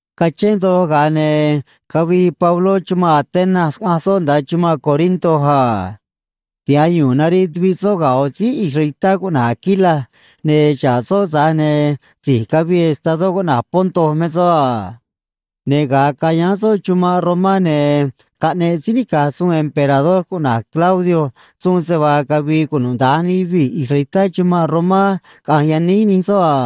Cachén doj, ga̱a ne̱ cavii Pabló chumanꞌ Atenas, caꞌanj soꞌ nda̱a chumanꞌ Corinto a. Tiha̱j yu̱u̱n nariꞌ tuviꞌ soꞌ ga̱ ꞌo̱ síí israelitá cuꞌna̱j Aquila, ne̱ xa̱ꞌ soꞌ, tza̱j ne̱ si̱j cavii estadó cuꞌna̱j Ponto me soꞌ a. Ne̱ ga̱a cayáán soꞌ chumanꞌ Romá, ne̱ caꞌneꞌ síí nica̱j suun emperador cuꞌna̱j Claudio suun se vaa cavi̱i̱ cunuda̱nj nij yuvii̱ israelitá chumanꞌ Romá caꞌa̱nj yaníj nij soꞌ a.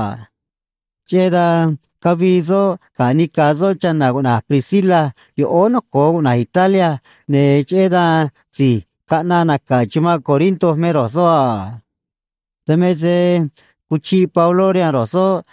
Cheꞌé dan cavii soꞌ ga̱ nica̱ soꞌ chana̱ cuꞌna̱j Priscila yoꞌóó noco̱o cuꞌna̱j Italia, ne̱ cheꞌé dan si̱j caꞌnaꞌ naca̱ chumanꞌ Corinto me ro̱j soꞌ a. Dan me se cuchiꞌ Pabló rihaan ro̱j soꞌ,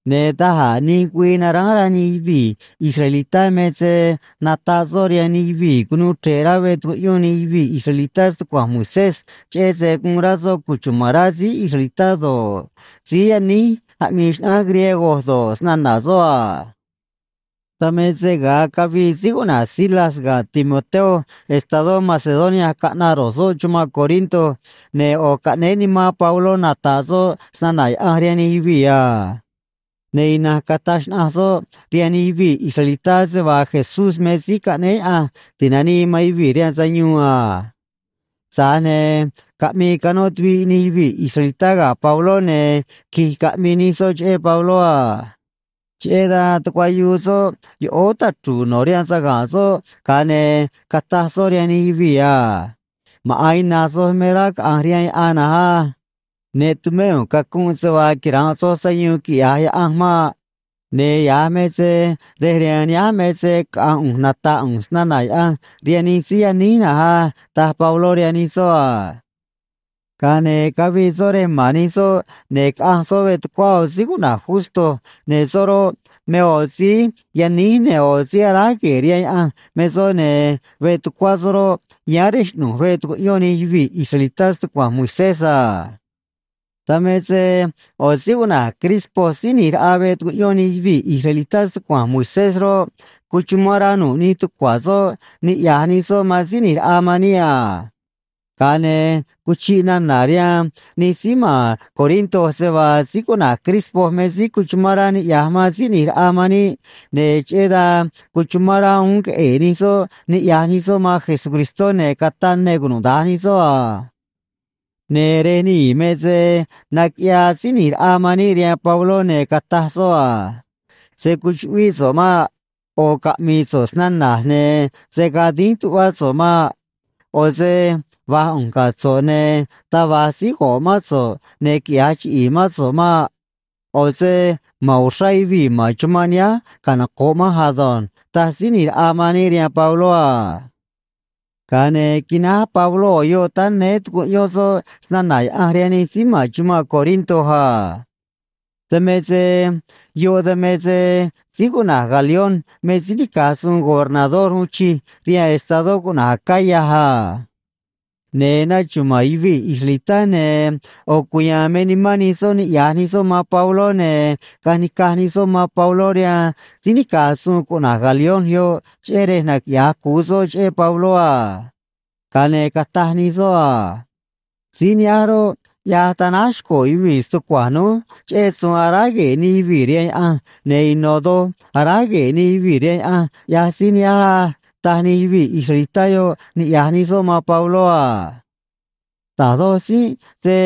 Ne̱ da̱j a̱ nij güii naránj rá nij yuvii̱ israelitá me se nataꞌ soꞌ rihaan nij yuvii̱ cunuu chre̱ꞌ rá veꞌ tucuꞌyón nij yuvii̱ israelitá stucua̱nj Moisés, cheꞌé se guun rá soꞌ cuchuma̱n rá síí israelitá do̱ꞌ, síí yaníj aꞌmii xnaꞌánj griego do̱ꞌ, snana̱ soꞌ a. Dan me se ga̱a cavii síí cuꞌna̱j Silas ga̱ Timoteo estadó Macedonia caꞌnaꞌ ro̱j soꞌ chumanꞌ Corinto, ne̱ ꞌo̱ caꞌnéé nimán Pabló nata̱ꞌ soꞌ snana̱ Yaꞌanj rihaan nij yuvii̱ a. Ne̱ ina̱nj cataj xnaꞌanj soꞌ rihaan nij yuvii̱ israelitá se vaa Jesús me Síí Caꞌnéé Yaꞌanj Ti̱nanii man Yuvii̱ rihaan Sayuun a. Tza̱j ne̱ caꞌmii canó tuviꞌ nij yuvii̱ israelitá ga̱ Pabló, ne̱ qui̱j caꞌmii nij soꞌ cheꞌé Pabló a. Cheꞌé dan tucuayuu soꞌ yoꞌóó tachru̱u̱ no̱ rihaan saga̱nꞌ soꞌ, ga̱a ne̱ cataj soꞌ rihaan nij yuvii̱ a: ―Maꞌa̱n ina̱nj soj me rá caꞌa̱nj rihaan yaꞌan na̱nj á. Ne tumé ꞌu̱nj cacunꞌ se vaa quira̱nꞌ soj sayuun quiꞌya̱j Yaꞌanj maꞌ. Ne̱ ya̱j me se rej rihaan nihánj me se caꞌa̱nj ꞌu̱nj nata̱ꞌ ꞌu̱nj snana̱ Yaꞌanj rihaan nij síí yaníj na̱nj á ―taj Pabló rihaan nij soꞌ a. Ga̱a ne̱ cavii soꞌ rej ma̱n nij soꞌ, ne̱ caꞌanj soꞌ veꞌ tucuá ꞌo̱ síí cuꞌna̱j Justo, ne̱ soꞌ roꞌ, me ꞌo̱ síí yaníj ne̱ ꞌo̱ síí aráj gue̱e̱ rihaan Yaꞌanj me soꞌ, ne̱ veꞌ tucuá soꞌ roꞌ, yáán rej xꞌnu̱j veꞌ tucuꞌyón nij yuvii̱ israelitá stucua̱nj Moisés a. Dan me se ꞌo̱ síí cuꞌna̱j Crispo síí ꞌni̱j raꞌa veꞌ tucuꞌyón nij yuvii̱ israelitá stucua̱nj Moisés roꞌ, cuchumán rá nu̱ꞌ nij tucua̱ soꞌ niꞌya̱j nij soꞌ man Síí ꞌNi̱j Raꞌa man níꞌ a. Ga̱a ne̱ cuchiꞌ nana̱ rihaan nij síí ma̱n Corinto se vaa síí cuꞌna̱j Crispo me síí cuchumán rá niꞌya̱j man Síí ꞌNi̱j Raꞌa man níꞌ, ne̱ cheꞌé dan cuchumán rá uún queꞌe̱e̱ nij soꞌ niꞌya̱j nij soꞌ man Jesucristó, ne̱ cataꞌ ne cunuda̱nj nij soꞌ a. Ne̱ rej nii̱ me se naquiꞌyaa Síí ꞌNi̱j Raꞌa man níꞌ rihaan Pabló, ne̱ cataj soꞌ a: ―Se̱ cuchuꞌvíꞌ so̱ꞌ maꞌ. ꞌO̱ caꞌmi̱i̱ so̱ꞌ snana̱j, ne̱ se̱ gaa dínj tuꞌvá so̱ꞌ maꞌ. ꞌO̱ se va̱j ꞌu̱nj ga̱ so̱ꞌ, ne̱ taj va̱j síí go̱ꞌ mán so̱ꞌ ne̱ quiꞌya̱j chiꞌi̱i̱ mán so̱ꞌ maꞌ. ꞌO̱ se ma̱n uxrá yuvii̱ ma̱n chumanꞌ nihánj canoco̱ꞌ manj ado̱nj ―taj Síí ꞌNi̱j Raꞌa man níꞌ rihaan Pabló a. Ga̱a ne̱ quináj Pabló ꞌo̱ yoꞌ táá néé, tucuꞌyón soꞌ snana̱ Yaꞌanj rihaan nij síí ma̱n chumanꞌ Corinto a. Dan me se yoꞌ dan me se síí cuꞌna̱j Galión me síí nica̱j suun gobernador uun chij rihaan estadó cuꞌna̱j Acaya a. Ne̱ naxuma̱a̱n yuvii̱ israelitá, ne̱ ꞌo̱ cuya̱a̱n me nimán nij soꞌ niꞌya̱j nij soꞌ man Pabló, ne̱ caꞌanj ni̱caj nij soꞌ man Pabló rihaan síí nica̱j suun cuꞌna̱j Galión yoꞌ, cheꞌé rej naquiꞌya̱j cu̱u soꞌ cheꞌé Pabló a. Ga̱a ne̱ cataj nij soꞌ a: ―Síí nihánj roꞌ, ꞌyaj tanáj xco̱ yuvii̱ stucua̱nj núj cheꞌé suun aráj gue̱e̱ nij yuvii̱ rihaan Yaꞌanj, ne̱ ino̱ doj aráj gue̱e̱ nij yuvii̱ rihaan Yaꞌanj, ꞌyaj síí nihánj á ―taj nij yuvii̱ israelitá yoꞌ, niꞌya̱j nij soꞌ man Pabló a. Da̱j doj tzínꞌ se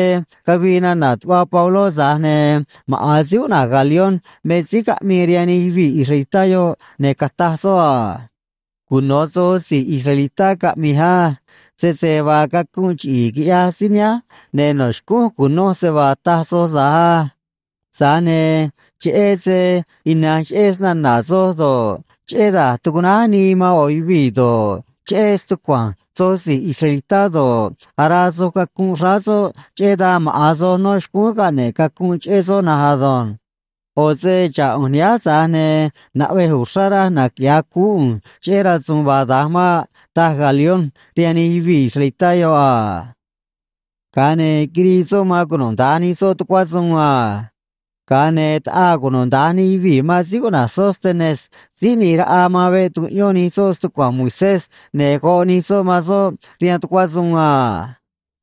cavii nana̱ tuꞌva Pabló, tza̱j ne̱ maꞌa̱n síí cuꞌna̱j Galión me síí caꞌmii rihaan nij yuvii̱ israelitá yoꞌ, ne̱ cataj soꞌ a: ―Cuno̱ soj si̱j israelitá caꞌmi̱j á. Sese vaa cacunꞌ chiꞌi̱i̱ quiꞌyaj síí nihánj, ne̱ no̱ xcúnj cu̱noj se vaa taj soj tza̱j á. Tza̱j ne̱ cheꞌé se ina̱nj cheꞌé snana̱ soj do̱ꞌ, cheꞌé da̱j tucuꞌnáj nii man ꞌo̱ yuvii̱ do̱ꞌ, cheꞌé stucua̱nj soj si̱j israelitá do̱ꞌ, araa soj cacunꞌ xráá soꞌ, cheꞌé dan maꞌa̱n soj no̱ xcúún caꞌne̱ꞌ cacunꞌ cheꞌé soꞌ na̱nj ado̱nj. ꞌO̱ se xa̱ꞌ ꞌu̱nj nihánj, tza̱j ne̱ naꞌvej uxrá raj naquiꞌya̱j cuú ꞌu̱nj cheꞌé rasu̱u̱n vaa da̱nj maꞌ ―taj Galión rihaan nij yuvii̱ israelitá yoꞌ a. Ga̱a ne̱ quirii soꞌ man cunuda̱nj nij soꞌ tucuá suun a. Ga̱a ne̱ taꞌaa cunuda̱nj nij yuvii̱ man síí cuꞌna̱j Sóstenes síí ꞌni̱j raꞌa man veꞌ tucuꞌyón nij soꞌ stucua̱nj Moisés, ne̱ goꞌ nij soꞌ man soꞌ rihaan tucuá suun a.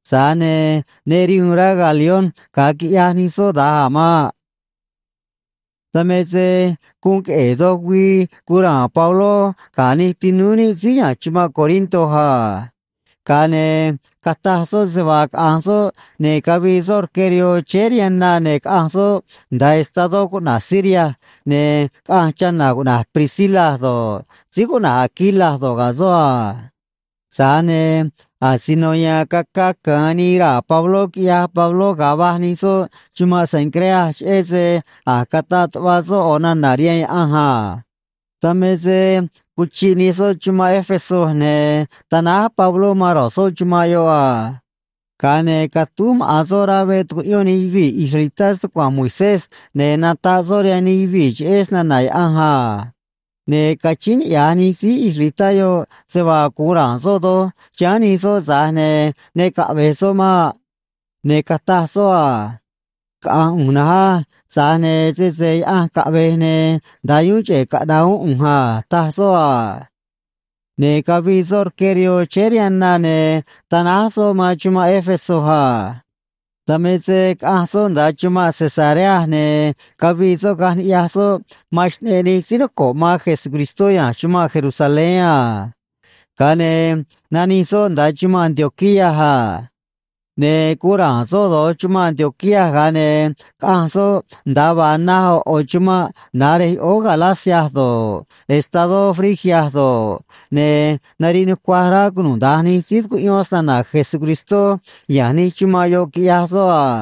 Tza̱j ne̱ ne rihu̱u̱n rá Galión ga̱a quiꞌyaj nij soꞌ da̱nj a̱ maꞌ. Dan me se guun queꞌe̱e̱ doj güii guun ra̱a̱n Pabló ga̱ nij tinúú níꞌ síí ya̱nj chumanꞌ Corinto a. Ga̱a ne̱ cataj soꞌ se vaa caꞌa̱nj soꞌ, ne̱ cavii soꞌ rque rihoo chéé rihaan na, ne̱ caꞌanj soꞌ nda̱a estadó cuꞌna̱j Siria, ne̱ caꞌanj chana̱ cuꞌna̱j Priscila do̱ꞌ, síí cuꞌna̱j Aquila do̱ꞌ, ga̱ soꞌ a. Tza̱j ne̱ asino ya̱a̱n caca ca̱an nii raa̱ Pabló, quiꞌyaj Pabló, ga̱a va̱j nij soꞌ chumanꞌ Cencrea, cheꞌé se a̱j cataꞌ tuꞌva soꞌ ꞌo̱ nana̱ rihaan Yaꞌanj a. Dan me se cuchiꞌ nij soꞌ chumanꞌ Éfeso, ne̱ tanáj Pabló man ro̱j soꞌ chumanꞌ yoꞌ a. Ga̱a ne̱ catúj maꞌa̱n soꞌ rá veꞌ tucuꞌyón nij yuvii̱ israelitá stucua̱nj Moisés, ne̱ nataꞌ soꞌ rihaan nij yuvii̱ cheꞌé snana̱ Yaꞌanj a. Ne̱ cachíín niꞌya̱j nij síí israelitá yoꞌ se vaa gu̱un ra̱a̱n soꞌ doj chiháán nij soꞌ, tza̱j ne̱ ne caꞌve̱j soꞌ maꞌ. Ne̱ cataj soꞌ a: ―Caꞌa̱nj ꞌu̱nj na̱nj á. Tza̱j ne̱ sese Yaꞌanj caꞌve̱j, ne̱ nda̱a yuún cheꞌe̱ caꞌna̱ꞌ uún ꞌu̱nj a ―taj soꞌ a. Ne̱ cavii soꞌ rque rihoo chéé rihaan na, ne̱ tanáj soꞌ man chumanꞌ Éfeso a. Dan me se caꞌanj soꞌ nda̱a chumanꞌ Cesarea, ne̱ cavii soꞌ caꞌanj ni̱ꞌyaj soꞌ man xꞌneꞌ nij síí noco̱ꞌ man Jesucristó ya̱nj chumanꞌ Jerusalén a. Ga̱a ne̱ nanij soꞌ nda̱a chumanꞌ Antioquía a. Ne̱ guun ra̱a̱n soꞌ do̱j chumanꞌ Antioquía, ga̱a ne̱ caꞌanj soꞌ nda̱a vaa naj ꞌo̱ ꞌo̱ chumanꞌ na̱j rej yoꞌóó Galacia do̱ꞌ, estadó Frigia do̱ꞌ, ne̱ nariꞌ nucuaj rá cunuda̱nj nij síí tucuꞌyón snana̱ Jesucristó ya̱nj nij chumanꞌ yoꞌ, quiꞌyaj soꞌ a.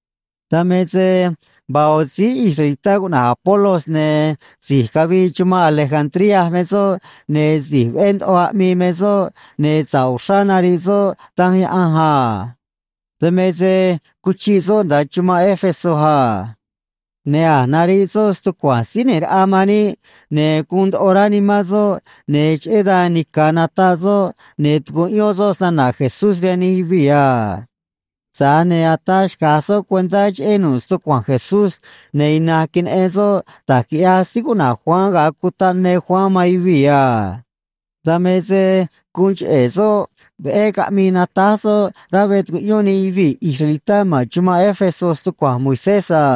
Dan me se vaa ꞌo̱ síí israelitá cuꞌna̱j Apolos, ne̱ si̱j cavii chumanꞌ Alejandría me soꞌ, ne̱ si̱j veꞌé ndoꞌo aꞌmii me soꞌ, ne̱ sa̱ꞌ uxrá nariꞌ soꞌ Danj Yaꞌanj a. Dan me se cuchiꞌ soꞌ nda̱a chumanꞌ Éfeso a. Ne̱ a̱j nariꞌ soꞌ stucua̱nj Síí ꞌNi̱j Raꞌa man níꞌ, ne̱ guun ndoꞌo rá nimán soꞌ, ne̱ cheꞌé dan nica̱ nataꞌ soꞌ ne̱ tucuꞌyón soꞌ snana̱ Jesús rihaan nij yuvii̱ a. Tza̱j ne̱ ataa xca̱j soꞌ cuentá cheꞌé nu̱ꞌ stucua̱nj Jesús, ne̱ ina̱nj queneꞌen soꞌ da̱j quiꞌyaj síí cuꞌna̱j Juan ga̱a cutaꞌ ne Juan man yuvii̱ a. Dan me se guun cheꞌe̱ soꞌ veꞌé caꞌmii natáj soꞌ rá veꞌ tucuꞌyón nij yuvii̱ israelitá ma̱n chumanꞌ Éfeso stucua̱nj Moisés a.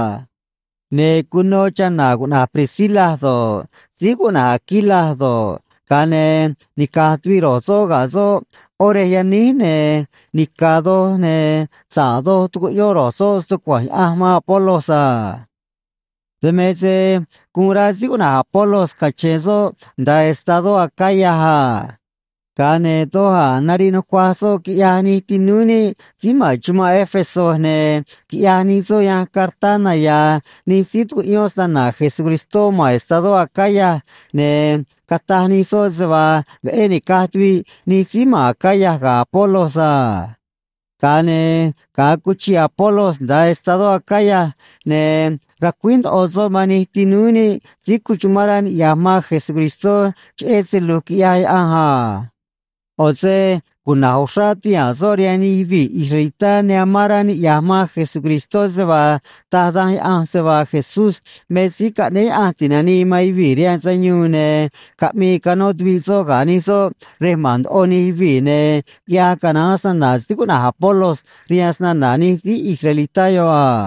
Ne̱ cuno chana̱ cuꞌna̱j Priscila do̱ꞌ, síí cuꞌna̱j Aquila do̱ꞌ, ga̱a ne̱ nica̱j tuviꞌ ro̱j soꞌ ga̱ soꞌ ꞌó rej yaníj, ne̱ nica̱ doj ne̱ sa̱ꞌ doj tucuꞌyón ro̱j soꞌ stucua̱nj Yaꞌanj man Apolos a. Dan me se guun rá síí cuꞌna̱j Apolos cache̱n soꞌ nda̱a estadó Acaya a. Ga̱a ne̱ doj a̱ nariꞌ nucuaj soꞌ quiꞌyaj nij tinúú níꞌ síí ma̱n chumanꞌ Éfeso, ne̱ quiꞌyaj nij soꞌ yanj cartá naya̱a̱ nij síí tucuꞌyón snana̱ Jesucristó ma̱n estadó Acaya, ne̱ cataj nij soꞌ se vaa veꞌé ni̱caj tuviꞌ nij síí ma̱n Acaya ga̱ Apolos a. Ga̱a ne̱ ga̱a cuchiꞌ Apolos nda̱a estadó Acaya, ne̱ racuíj ndoꞌo soꞌ man nij tinúú níꞌ síí cuchumán rá niꞌya̱j man Jesucristó cheꞌé se lu̱j quiꞌyaj Yaꞌanj a. ꞌO̱ se cuna̱j uxrá tihaa̱n soꞌ rihaan nij yuvii̱ israelitá ne amán rá niꞌya̱j man Jesucristó se vaa taj Danj Yaꞌanj se vaa Jesús me Síí Caꞌnéé Yaꞌanj Ti̱nanii man Yuvii̱ rihaan Sayuun, ne̱ caꞌmii canó tuviꞌ soꞌ ga̱ nij soꞌ rej ma̱n ndoꞌo nij yuvii̱, ne̱ quiꞌyaj canaán snana̱ síí cuꞌna̱j Apolos rihaan snana̱ nij síí israelitá yoꞌ a.